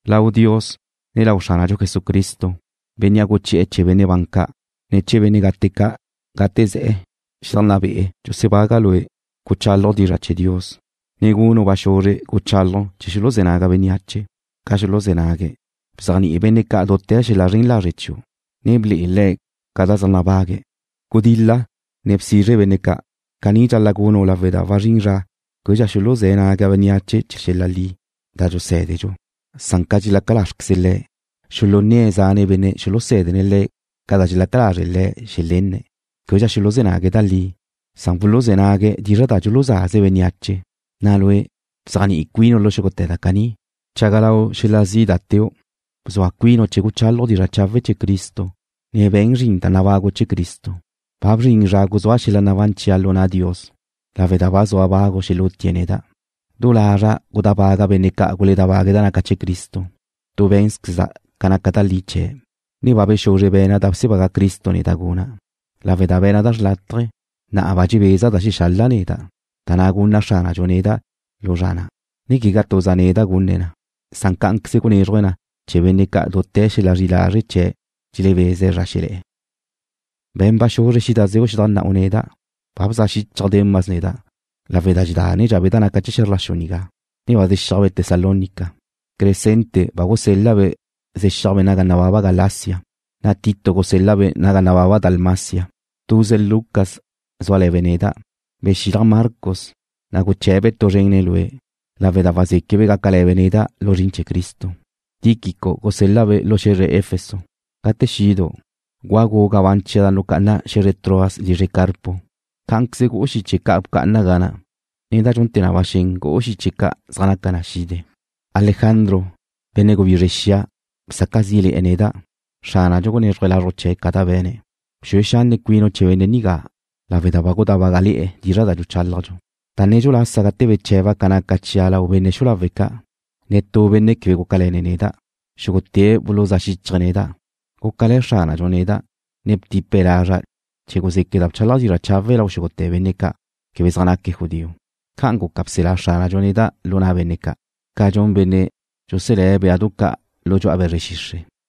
Lau Dios, ne lau Xránadxu Jesucristo, Bénnea' guchi'e̱ chee̱ benne' ban ca', ne chee̱ benne' gate ca' gate ze̱'e̱ xedajnná be'e̱, dxusebaga' lue' guchálaju' dizra' chee̱ Dios, ne gunu' ba xuzre guchálaju' che xuluzé̱ naga bénneache, ca xuluzé̱ nague̱'. Bzéajni'i benne' ca' dute̱ xel-la zren lazre' chiu', ne ble'e le̱' ca da zaj nabague̱'. Gudil-la, ne bsizre benne' ca'. Caní dxal-la' gunu' lawe' da wazrín zra québedxa xuluzé̱ naga bénneache chee̱ xel-la li da dxusé̱dedxu. Ca dxelezá lázrqueze le̱', xulunné̱' zane' benne' xulusé̱dene̱' le̱' ca da dxelaca lázreze le̱' xelenne̱'. Québedxa xuluzé̱ nague̱' da li. Wuluzé̱ nague̱' dizra' da dxuluzaze bénneache. Na' lue', bzéajni'i cuinu' lu xúgute̱ da caní. Bchaga lau xel-la zi' da teu'. Bzua cuinu' chee̱ guchálaju' dizra' chawe' chee̱ Cristo, ne be̱n zrin da nabagu' chee̱ Cristo. Ba bzrin zra guzúa' xel-la nabán chia' lu na' Dios, lawe' da ba zua bagu xelutie̱' neda'. Du lazra' gudábaga' benne' ca' guledábague̱' da naca chee̱ Cristo. Tu bé̱nzqueza' ca naca da li chee̱', ne ba bexuzre be̱na' da bsebaga Cristo neda' guna'. Lawe' da be̱na' da xrlátaje, na'a ba dxebeza da dxexala' neda', da na' gunna Xránadxu neda' lu zra na', ne quegá tuza' neda' gunne̱' na. Cá'anqueze gunézruje̱' na chee̱ benne' ca' dute̱ xel-la zri'i lazre' chee̱' dxelebeze̱' zra xelé̱'e̱. Be̱n ba xuzre xídazeu' xedajnná'u neda'. Ba guleaj xichaj Demas neda' lawe' da dxedánedxabe' da naca chee̱ xe̱zr la xu nigá, ne ba zexíajbe' Tesalónica. Crescente ba gusel-la'-be' zexíajbe' naga nababa Galacia, na' Tito gusel-la'-be' naga nababa Dalmacia. Tuze Lucas zúale̱be' neda'. Bexilaj Marcos, na' guché̱'-be' tu zrén le̱n lue', lawe' da wazéquebe' gácale̱be' neda' lu zrin chee̱ Cristo. Tíquico gusel-la'-be' lu xe̱zre Efeso. Gate xidu', gúagu' gabán chia' da nucá'ana' xe̱zre Troas lizre Carpo. Cá'anqueze gu'u xiche ca' bcá'ana' ga na', ne da dxunte̱ na ba xen gu'u xiche ca' zaj naca na xide. Alejandro, benne' gubizre xia bsaca' zí'le̱'e̱ neda'. Xránadxu gunézruje̱' lazruj chee̱' ca da be̱ne̱'. Bxue xanne cuinu' chee̱ benne' nigá lawe' da ba gudábagale̱'e̱ dizra' da dxuchálajdxu. Da nedxu lasa gate beche̱ba' ca naca chia' lau benne' xu'u lawe' ca', netú benne' quebe gúcale̱ne̱' neda'. Xúgute̱' buluzá' xíchaje̱' neda'. Gúcale̱ Xránadxu neda', ne btipe̱' lazra' chee̱ guzéqueda' bchálaja' dizra' chawe' lau xúgute̱ benne' ca' quebe zaj naque̱' judío. Ca'an guca bselá Xránadxu neda' lu na' benne' ca', ca dxun benne' dxuselé̱' béadu ca' lu dxu'a be̱zre xixre',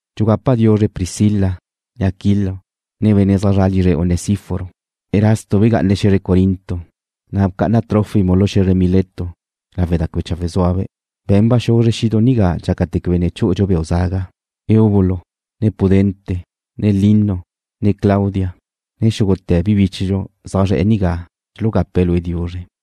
Dxugapa' diuzre Priscila, ne Aquilo, ne benne' zaj zra' lizre Onesíforo. Erasto begá'anabe' xe̱zre Corinto, na' bcá'ana' Trófimo lu xe̱zre Mileto lawe' da quebe chawe' zúabe'. Be̱n ba xuzre xidu' nigá dxácate̱ quebe ne chú'udxu beu' zaga. Eubulo, ne Pudente, ne Lino, ne Claudia, ne xúgute̱ bi bíchedxu zaj zre̱'e̱ nigá dxulugape̱' lue' diuzre.